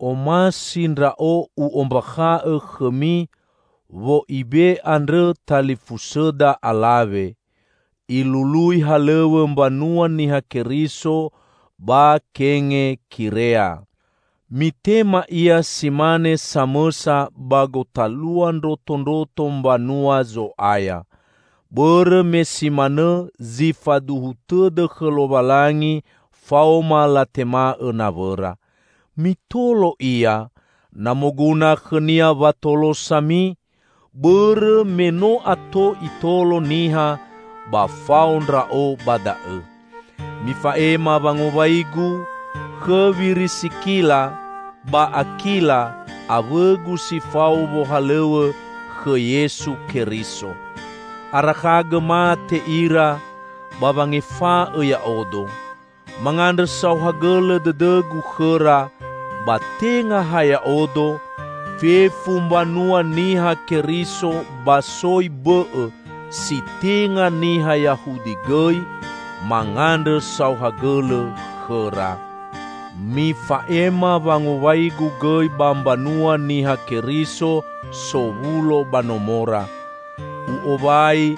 Omasi ndra'o u'ombakha'õ khõmi Wo'ibe andrõ talifusõda alawe. Ilului halõw̃õ mbanua Niha Keriso ba Kengekirea. Mitema ia si mane samõsa ba gotalua ndrotondroto mbanua Zo'aya. Bõrõ me si manõ zi faduhu tõdõ khõ Lowalangi faoma latema'õ nawõra. Mitolo ia, na moguna khõnia watolosami, bõrõ me no ato itolo niha ba fao ndra'o ba da'õ. Mifa'ema wangowaigu khõ Wirisikila ba Akila, awõgu si fao wohalõw̃õ khõ Yesu Keriso. Arakhagõ mate ira ba wangefa'õ ya'odo. Mangandrõ saohagõlõ dõdõgu khõra -- ba tenga ha ya'odo, fefu mbanua Niha Keriso ba soi bõ'õ si tenga niha Yahudi gõi mangandrõ saohagõlõ khõra. Mifa'ema wangowaigu gõi ba mbanua Niha Keriso sowulo ba nomora. U'owai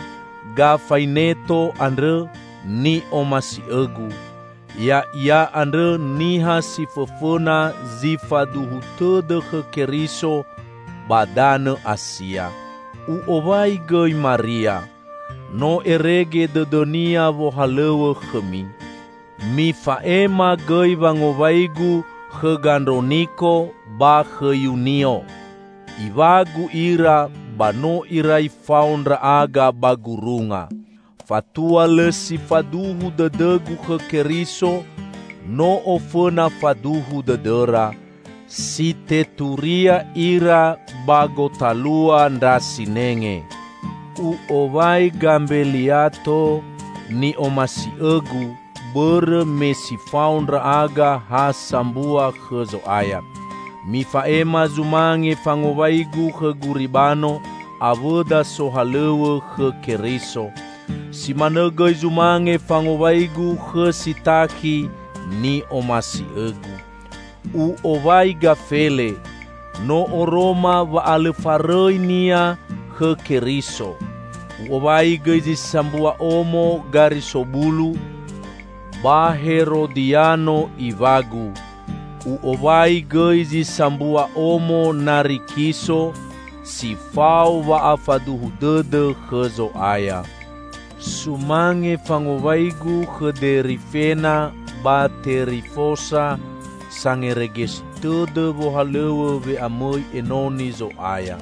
Gafaineto andrõ ni'omasi'õgu. Ya'ia andrõ niha si fõfõna zi faduhu tõdõ khõ Keriso ba danõ Asia. U'owai gõi Maria. No erege dõdõnia wohalõw̃õ khõmi. Mifa'ema gõi wangowaigu khõ Gandroniko ba khõ Yunio. Iwagu ira ba no irai fao ndra'aga ba gurunga. Fatua lõ si faduhu dõdõgu khõ Keriso, no ofõna faduhu dõdõra. Si teturia ira ba gotalua ndra sinenge. U'owai Gambeliato, ni'omasi'õgu bõrõ me si fao ndra'aga ha sambua khõ Zo'aya. Mifa'ema zumange fangowaigu khõ Guribano, awõda sohalõw̃õ khõ Keriso. Si manõ gõi zumange fangowaigu khõ Sitakhi ni'omasi'õgu. U'owai Gafele. No oroma wa'alõfarõinia khõ Keriso. U'owai gõi zi sambua omo Garisobulu, ba Herodiano, iwagu. U'owai gõi zi sambua omo Narikiso, si fao wa'afaduhu dõdõ khõ Zo'aya. Sumange fangowaigu khõ Derifena ba Terifosa sangeregesi tõdõ wohalõw̃õ we'amõi enoni Zo'aya.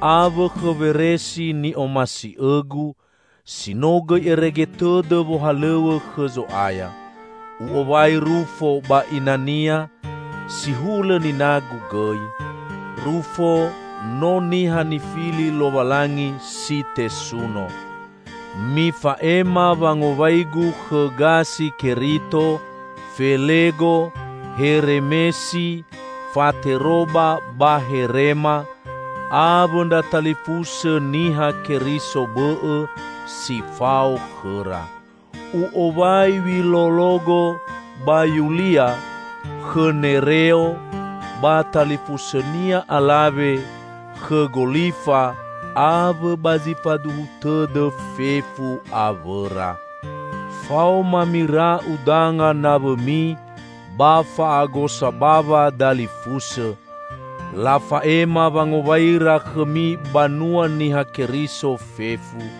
Awõ khõ Weresi ni'omasi'õgu, si no gõi erege tõdõ wohalõw̃õ khõ Zo'aya. U'owai Rufo ba inania, si hulõ ninagu gõi. Rufo no niha nifili Lowalangi si tesuno. Mifa'ema wangowaigu khõ Gasi-Kerito, Felego, Hereme, Fateroba ba Herema, awõ ndra talifusõ Niha Keriso bõ'õ si fao khõra. U'owai Wilologo ba Yulia; khõ Nereo ba talifusõnia alawe; khõ Golifa awõ ba zi faduhu tõdõ fefu awõra. Faoma mira'u danga nawõmi ba fa'agosa bawa dalifusõ. Lafa'ema wangowaira khõmi banua Niha Keriso fefu.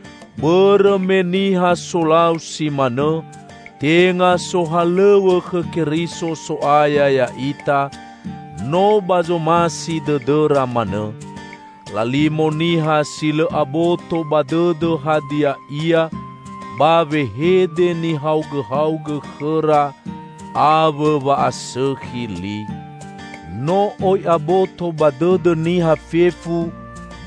Bõrõ me niha solau si manõ tenga sohalõw̃õ khõ Keriso So'aya ya'ita, no ba zomasi dõdõra manõ. Lalimo niha si lõ aboto ba dõdõ hadia ia ba wehede nihaogõhaogõ khõra awõ wa'asõkhi li. No oi aboto ba dõdõ niha fefu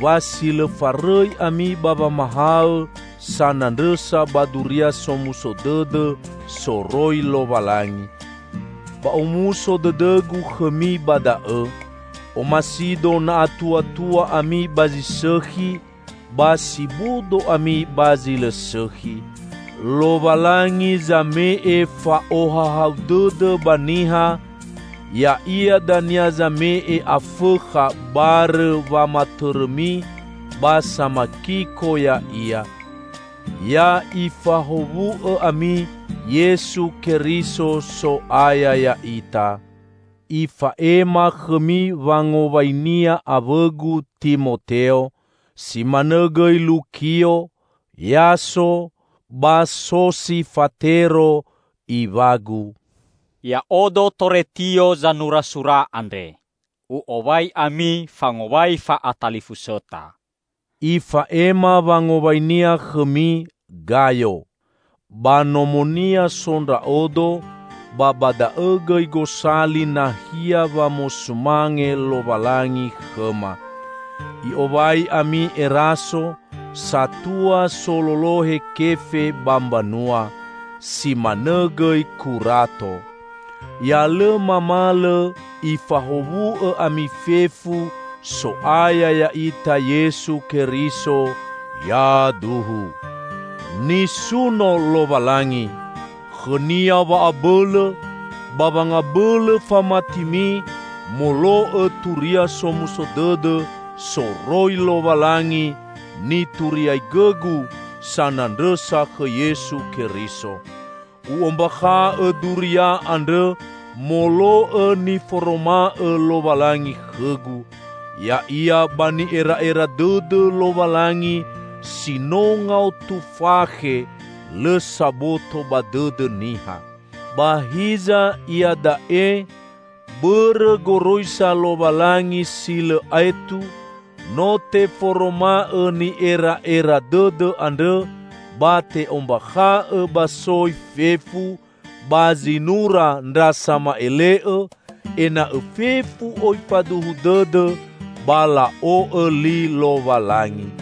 wa si lõ farõi ami ba wamahaõ sanandrõsa ba Duria Somuso Dõdõ soroi Lowalangi. Ba omuso dõdõgu khõmi ba da'õ. Omasido na atuatua ami ba zi sõkhi, ba si bodo ami ba zi lõ sõkhi. Lowalangi zame'e fa'ohahau dõdõ ba niha, ya'ia dania zame'e Afõkha barõ wamatõrõmi ba samakiko ya'ia. Ya Ifahowu'õ ami Yesu Keriso So'aya ya'ita! Ifa'ema khõmi wangowainia awõgu Timoteo. Si manõ gõi Lukio, Yaso ba Sosifatero, iwagu. Ya'odo Toretio zanura sura andre. U'owai ami fangowai fa'atalifusõta. Ifa'ema wangowainia khõmi Gayo. Ba nomonia so ndra'odo ba ba da'õ gõi gosali nahia wamosumange Lowalangi khõma. I'owai ami Eraso, satua sololohe kefe ba mbanua. Si manõ gõi Kurato. [Ya lõ mamalõ Ifahowu'õ ami fefu So'aya ya'ita Yesu Keriso. Yaduhu.] Nisuno Lowalangi! Khõnia wa'abõlõ ba wangabõlõ famatimi molo'õ Turia Somuso Dõdõ soroi Lowalangi nituriaigõgu sanandrõsa khõ Yesu Keriso. U'ombakha'õ duria andrõ molo'õ niforoma'õ Lowalangi khõgu; ya'ia ba ni'era'era dõdõ Lowalangi si no ngaotu fakhe lõ saboto ba dõdõ niha. Ba hiza, iada'e, bõrõ goroisa Lowalangi si lõ aetu, no teforoma'õ ni'era'era dõdõ andrõ ba te'ombakha'õ ba soi fefu ba zinura ndra sama'ele'õ, ena'õ fefu oi faduhu dõdõ ba la'o'õ li Lowalangi.